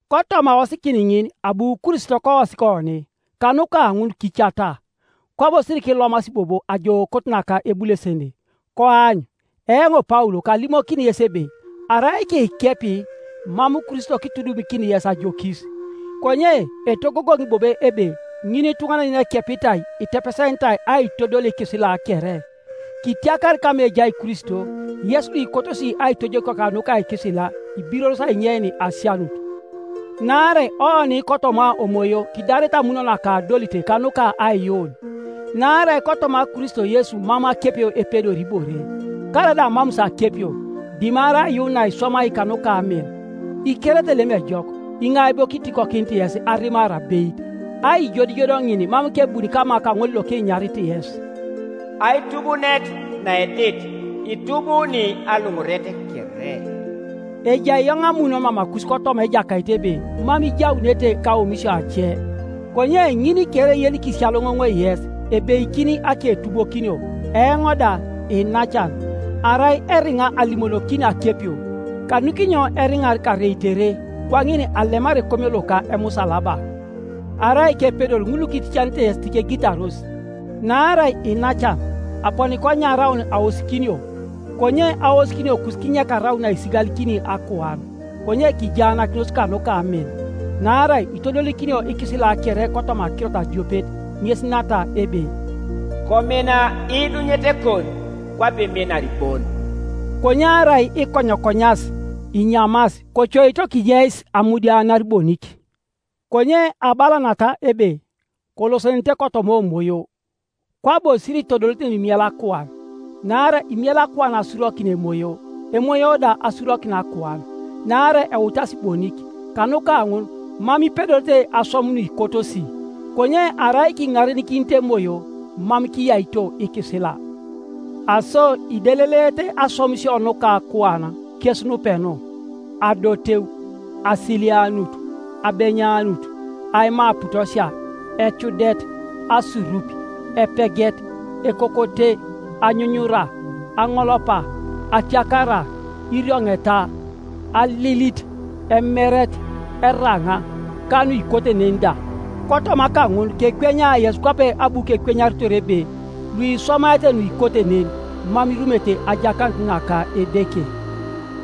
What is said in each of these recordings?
Kotoma aosikin ŋin abu Kristo koosik oni; kanuka ŋun kicata, kwabo sirikilomasi bobo ajookot naka ebulesene. Koany, eoŋ Paul kalimokini yes ebe arai kiikepi, mam Kristo kitudumikini yes ajokis. Konye etogogoŋi bobo ebe ŋinituŋanan yenekepitai itepesenitai aitodol ikisila kere. Kitiakar kama ejai Kristo, yes luikotosi aitojokio kanuka ikisila; ibiroros ainyein asianut. Naarai oni kotoma Omoyo kidarete amun naka adolit kanuka aiyuun. Naarai kotoma Kristo Yesu mam akepio epedori ibore, karaida amamus akepio, dimarai aiyuun naiswamai kanuka amin. Ikerete lem ejok, iŋai bo kitikokinit yes arimar abeit? Aijodijod ŋin mam kebuni kama kaŋol lokinyarit yes. Aitubuunet naedit itubuuni aluŋuret kere. Ejai eoŋ amun mamakus kotoma Ejakait ebe mam ijaunete kaomisio ace, konye ŋin kere yenikisiyaloŋoŋoi yes, ebeikini aketubokinio. Eoŋ da, iinacan, arai eriŋa alimonokini akepio, kanukinyo eriŋar kareitere? Kwaŋin alemar ekomio loka emusalaba. Arai kepedor ŋul lukiticanete yes tikegitaros! Naarai iinacan, aponi konyaraun aosikinio; konye aosikiniokus kinyek araun naisigalikini akuan, konye kijaanakinos kanuka amin. Naarai itodolikinio ikisila kere kotoma akirot adiopet, ŋes nata ebe, “Komina iidunyetekon kwape iminar bon.” Konye arai ikonyokonyas, inyamas, kocoito kinyeis amudianar bonik. Konye abala nata ebe, Kolosenenete kotoma Omoyo, kwabo siritodolete nuimiela akuan. Naarai imiela akuan asurokin Emoyo, Emoyo da asurokin akuan; naarai eutasi bonik; kanuka ŋun mam ipedorete aswam nuikotosi. Konye arai kiŋarenikinit Emoyo, mam kiyaito ikisila. Aso ideleleete aswamisio nuka akuan, kes nupenu: adoteu, asilianut, abenyanut, aima aputosia, ecudet, asurup, epeget, ekokote, anyunyura, aŋolopa, atiakara, irioŋeta, alilit, emeret, eraŋa, ka nuikote nen da. Kotoma kaŋun kekwenya yes kwape abu kekwenyaritor ebe, luiswamaete nuikote nen mam irumete ajakanut naka Edeke.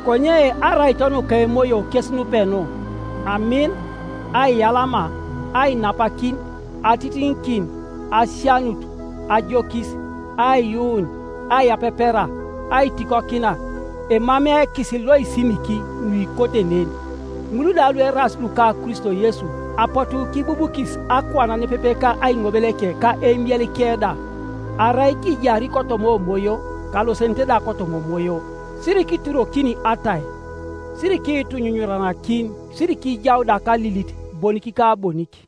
Konye araito nuka Emoyo kes nupenu: amin, aiyalama, ainapakin, atitiŋikin, asianut, ajokis, aiyuun, aiyapepera, aitikokina; emamei ekisil loisimiki nuikote nen. Ŋul da lueraas luka Kristo Yesu apotu kibubukis akuan nepepe ka aiŋobeleke ka eimielike da. Arai kijari kotoma Omoyo, kalosenenete da kotoma Omoyo. Sirikiiturokin atai, sirikiitunyunyuranakin, sirikiijau da kalilit bonik ka bonik.